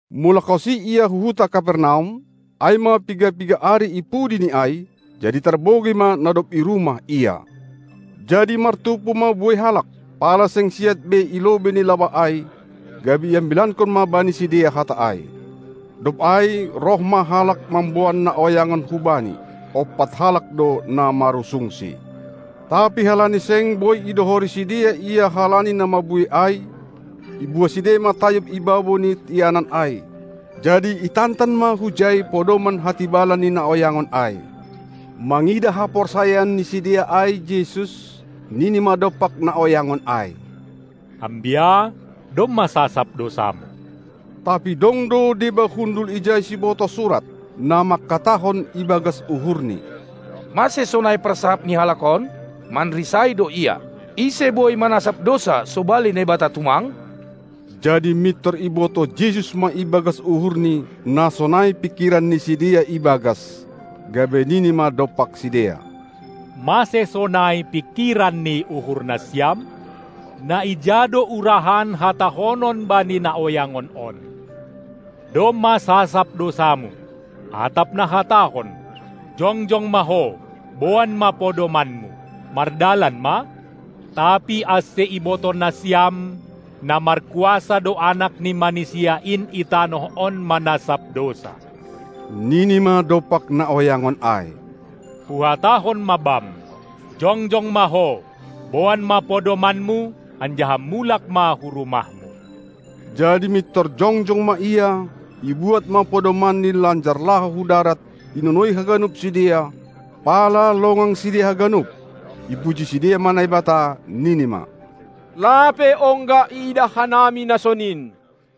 MulakhonSi Ia hu huta Kapernaum, ai ma piga-piga ari ipudi ni ai, jadi tarbogei ma na dob i rumah Ia. Jadi martumpu ma buei halak, pala seng siat be i lobei ni labah ai, gabe iambilankon ma bani sidea Hata ai. Dob ai roh ma halak mamboan na oyangon hu Bani, ompat halak do na marusungsi. Tapi halani seng boi idohori sidea Ia halani na mabuei ai, ibuha sidea ma tayub i babou ni ianan ai; jadi itantan ma hujai podoman hatibalan ni na oyangon ai. Mangidah haporsayaon ni sidea ai Jesus, nini ma dompak na oyangon ai: Ambia, domma sasap dousamu! Tapi dong do deba hundul ijai sibotoh surat, na mangkatahon ibagas uhurni: Mase sonai parsahap ni halak on? Manrisai do Ia! Ise boi manasap dousa sobali Naibata tumang? Jadi mintor ibotoh Jesus ma ibagas uhurNi, na sonai pingkiran ni sidea i bagas, gabe nini ma dompak sidea: Mase sonai pingkiran ni uhur nasiam? Naija do urahan hatahonon bani na oyangon on: "Domma sasap dousamu", atap nahatahon: "Jongjong ma ho, boan ma podomanmu, mardalan ma"? Tapi ase ibotoh nasiam na markuasa do Anak ni Manisia in i tanoh on manasap dousa, nini ma dompak na oyangon ai: Huhatahon ma bam: "Jongjong ma ho, boan ma podomanmu anjaha mulak ma hu rumahmu". Jadi mintor jongjong ma ia, ibuat ma podomanni lanjar laho hu darat, inonoi haganup sidea, pala longang sidea haganup. Ipuji sidea ma Naibata, nini ma: Lape ongga iidah hanami na sonin!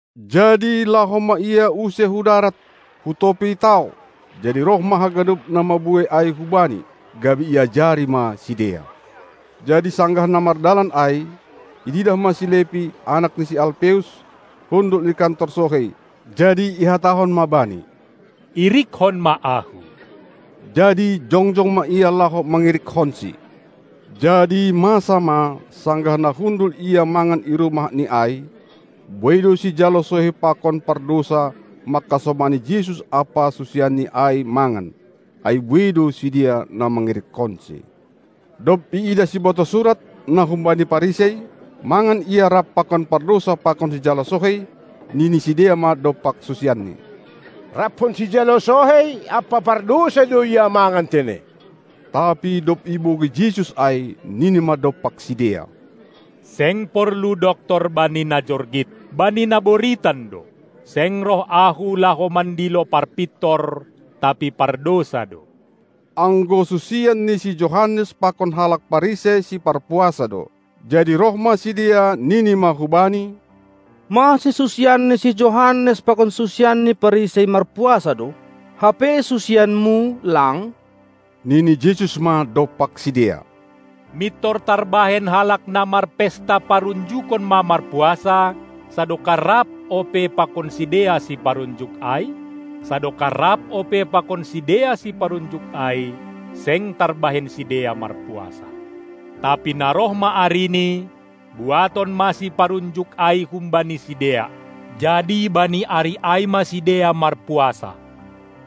Jadi laho ma Ia use hu darat, hu topi tao, jadi roh ma haganup na mabuei ai hu Bani, gabe iajari ma sidea. Jadi sanggah na mardalan ai, iidah ma si Lepi, anak ni si Alpeus, hundul i kantor sohei; jadi ihatahon ma bani: Irikkon ma Ahu! Jadi jongjong ma ia laho mangirikkonsi. Jadi masa ma, sanggah na hundul Ia mangan i rumahni ai, buei do sijalo sohei pakon pardousa mangkasomani Jesus ampa susianNi ai mangan; ai buei do sidea na mangirikkonSi. Dob iidah sibotoh surat na humbani Parisei, mangan Ia rapkon pardousa pakon sijalo sohei, nini sidea ma dompak susianni: Rapkon sijalo sohei ampa pardousa do Ia mangan tene! Tapi dob ibogei Jesus ai, nini ma dompak sidea: Seng porlu doktor bani na jorgit, bani na boritan do! Seng roh Ahu laho mandilo parpintor, tapi pardousa do. Anggo susian ni si Johannes pakon halak Parisei siparpuasa do. Jadi roh ma sidea, nini ma hu Bani: Mase susian ni si Johannes pakon susian ni Parisei marpuasa do, hape susianMu lang? Nini Jesus ma dompak sidea: Mintor tarbahen halak na marpesta parunjukon ma marpuasa, sadokah rap ope pakon sidea siparunjuk ai? Sadokah rap ope pakon sidea siparunjuk ai, seng tarbahen sidea marpuasa. Tapi na roh ma arini, buaton ma siparunjuk ai humbani sidea; jadi bani ari ai ma sidea marpuasa.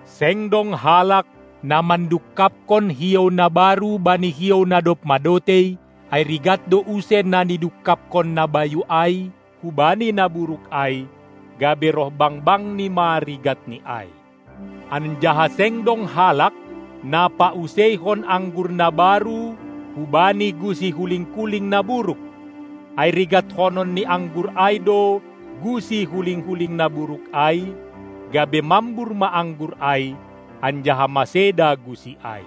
Seng dong halak, na mandungkapkon hiou na baru bani hiou na dob madotei, ai rigat do use na nidungkapkon na bayu ai hubani na buruk ai, gabe roh bangbangni ma rigatni ai. Anjaha seng dong halak, na pauseihon anggur na baru hubani gusi huling-kuling na buruk; ai rigatkonon ni anggur ai do gusi huling-kuling na buruk ai, gabe mambur ma anggur ai, anjaha maseda gusi ai.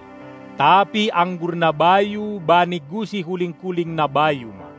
Tapi anggur na bayu bani gusi huling-kuling na bayu ma.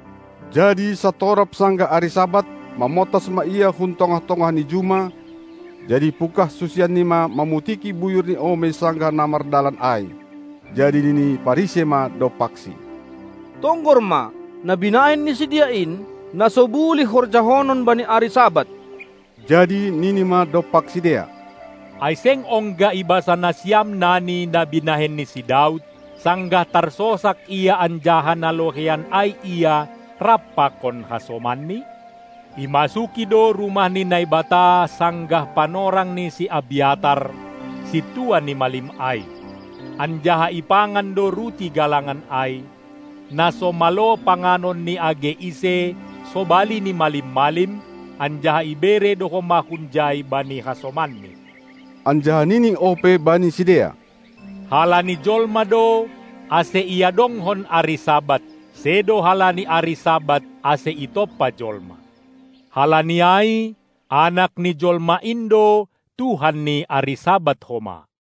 Jadi santorap sanggah ari Sabat, mamontas ma Ia hun tongah-tongah ni juma; jadi ipungkah susianNi ma mamutiki buyur ni omei sanggah na mardalan ai. Jadi nini Parisei ma dompakSi: Tonggor ma, na binahen ni sidea in, na so bulih horjahonon bani ari Sabat! Jadi nini ma dompak sidea: Ai seng ongga ibasa nasiam nani na binahen ni si Daud, sanggah tarsosak ia anjaha na loheian ai ia rap pakon hasomanni? Imasuki do rumah ni Naibata sanggah panorang ni si Abyatar, sintua ni malim ai, anjaha ipangan do ruti galangan ai, na so malo panganon ni age ise sobali ni malim-malim, anjaha ibere do homa hunjai bani hasomanni. Anjaha nini ope bani sidea: Halani jolma do, ase iadongkon ari Sabat, sedo halani ari Sabat ase itompa jolma. Halani ai Anak ni jolma in do Tuhan ni ari Sabat homa.